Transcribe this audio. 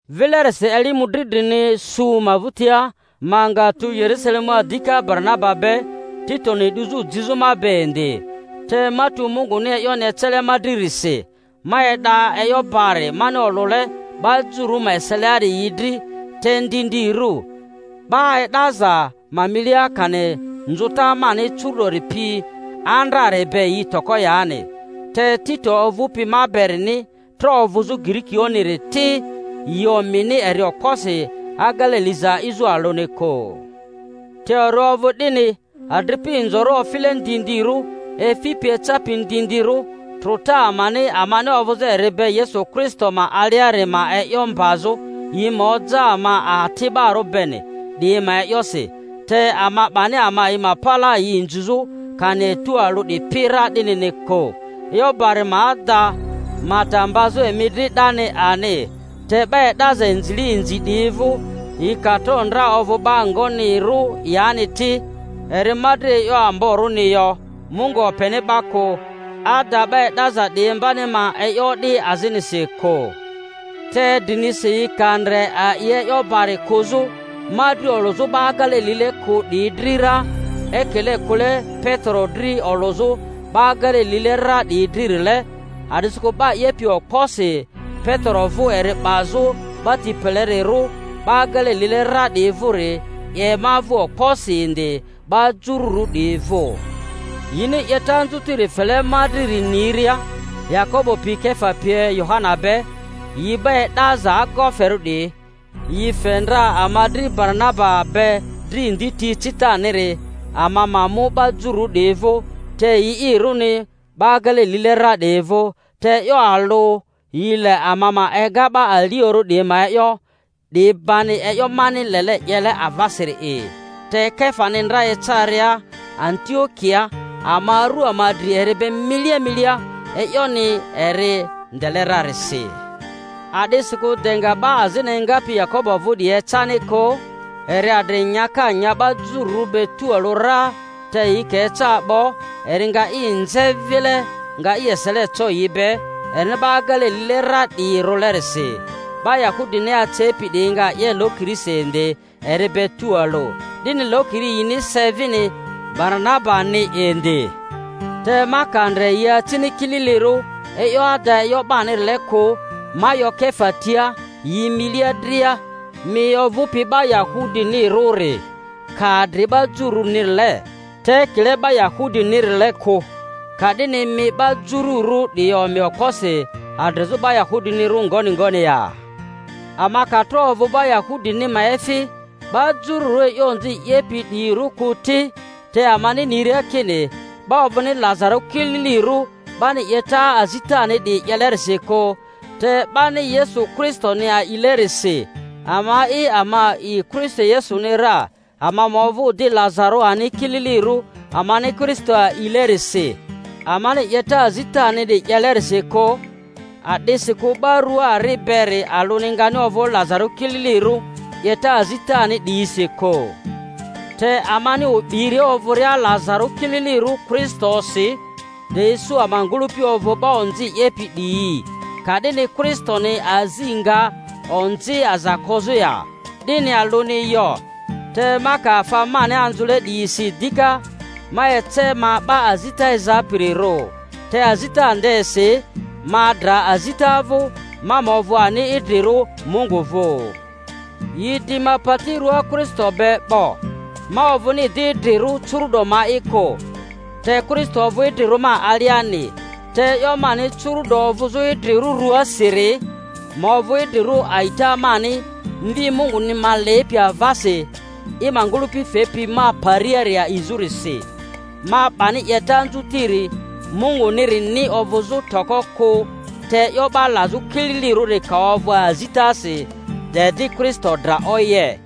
Vilerisi eli mᴜdri drini su ma vᴜtia ma nga tu Yerusalemua dika Baranaba be, Titoni 'duzᴜ jizᴜ ma be indi. Te ma tu Munguni e'yoni ecele ma dririsi; ma e'da e'yo bari mani olᴜle 'ba Jururᴜ ma eseliari yi dri (te ndindirᴜ, 'ba e'daza ma inilia), kani nzᴜta mani curu'dori pi andrari be yi toko yani. Te Tito ovᴜpi ma berini tro ovᴜzᴜ Girikioᴜ-niri ti, yi omini eri okposi agele liza a'izᴜ alᴜni kᴜ. Te eri ovᴜ 'dini adripi inzorᴜ ofile ndindirᴜ, efipi ecapi ndindirᴜ trᴜta amani amani ovᴜzᴜ eri be Yesu Kristo ma aliari ma e'yo mbazᴜ, yi ma oja ama ati'barᴜ beni, 'diyi ma e'yosi— te ama 'bani ama yi ma palaa yi inzizᴜ kani etu alᴜ 'dipi ra 'dinini kᴜ, e'yo bari ma ada ma ta mbazᴜ emi dri 'dani ani. Te 'ba e'daza inzile inzi 'diyi vᴜ—yi ka tro ndra ovᴜ 'ba ngonirᴜ yani ti, eri ma dri e'yo amborᴜni yo; Mungu openi 'ba kᴜ —ada, 'ba e'daza 'diyi imbani ma e'yo o'di azinisi kᴜ; te drinisi yi ka ndre a'i e'yo bari kᴜzᴜ ma dri olᴜzᴜ 'ba agele lile kᴜ 'diyi dri ra ekile kᴜle Petero dri olᴜzᴜ 'ba agele lile ra 'diyi dririle, (a'disikᴜ 'ba 'yepi okposi Petero vᴜ eri 'bazᴜ 'ba tini pelerirᴜ 'ba agele lile ra 'diyi vᴜri 'ye ma vᴜ okposi indi 'ba jurᴜru 'diyi vᴜ), yini 'yeta anzutiri fele ma driri niria, Yakobo pi Kefa pie Yohana be, yi 'ba e'daza agoferᴜ 'diyi, yi fe ndra ama dri Baranaba be dri ndi ti ecitaniri, ama ma mu 'ba jururᴜ 'diyi vᴜ, te yi'irᴜni 'ba agele lile ra 'diyi vᴜ; te e'yo alᴜ, yi le ama ma ega 'ba aliorᴜ 'diyi ma e'yo, 'di bani e'yo mani lele 'yele avasiri'i. Te Kefani ndra ecaria Antio-kiaa ama aru ama dri eri be milia milia, e'yoni eri ndele rarisi. A'disikᴜ de nga 'ba azini engapi Yakobo vᴜ 'diyi ecani kᴜ, eri adri nyaka nya 'ba jururᴜ be tualᴜ ra; te yi ka eca 'bo, eri nga i nze vile, nga i esele co yi be, erini 'ba agele lile ra 'diyi rᴜlerisi. 'Ba Yahudini acepi 'diyi nga 'ye lokirisi indi eri be tualᴜ, 'dini lokiri yini se vini Baranaba-ni indi. Te ma ka ndre yi acini kililirᴜ e'yo ada e'yo barinile kᴜ, ma 'yo Kefa tia yi milia dria, Mi ovᴜpi 'ba Yahudinirᴜri ka adri 'ba jururᴜrile, te ekile 'ba Yahudinirile kᴜ, ka'dini mi 'ba jururᴜ 'diyi omi okposi adrizᴜ 'ba Yahudinirᴜ ngoni ngoni ya? Ama ka tro ovᴜ 'ba Yahudini ma efi, 'ba jururᴜ e'yo onzi 'yepi 'diyirᴜ kᴜ ti, te amani niria kini 'ba ovᴜni lazarᴜ kililirᴜ 'bani 'yeta azitani 'diyi 'yelerisi kᴜ te 'bani Yesu Kristoni a'ilerisi, ama'i ama a'i Kristo Yesuni ra, ama ma ovᴜ di lazarᴜ ani kililirᴜ amani Kristo a'ilerisi, amani 'yeta azitani 'diyi 'yelerisi kᴜ, a'disikᴜ 'ba rua ari beri alᴜni ngani ovᴜ lazarᴜ kililirᴜ 'yeta azitani 'diyisi kᴜ. Te amani o'biria ovᴜria lazarᴜ kililirᴜ Kristosi, de isu ama ngᴜlᴜpi ovᴜ 'ba onzi 'yepi 'diyi, ka'dini Kristoni azi nga onzi aza kozᴜ ya? 'Dini alᴜni yo! Te ma ka afa mani anzᴜle 'diyi si dika, ma ece ma 'ba azita ezapirirᴜ. Te azita ndesi ma dra azita vᴜ, ma ma ovᴜ ani idrirᴜ Mungu vᴜ. Yi di ma pati ruaa Kristo be 'bo; ma ovᴜni di idrirᴜ curu'do ma'i kᴜ, te Kristo ovᴜ idrirᴜ ma aliani; te e'yo mani curᴜ'do ovᴜzᴜ idrirᴜ rᴜasiri, ma ovᴜ idrirᴜ a'ita mani Mvi Munguni ma lepi avasi, i ma ngᴜlᴜpi fepi ma pariari a'izᴜrisi. Ma 'bani 'yeta anzutiri Mungunirini ovᴜzᴜ toko kᴜ; te e'yo 'ba lazᴜ kililirᴜri ka ovᴜ azitasi, de di Kristo dra oye.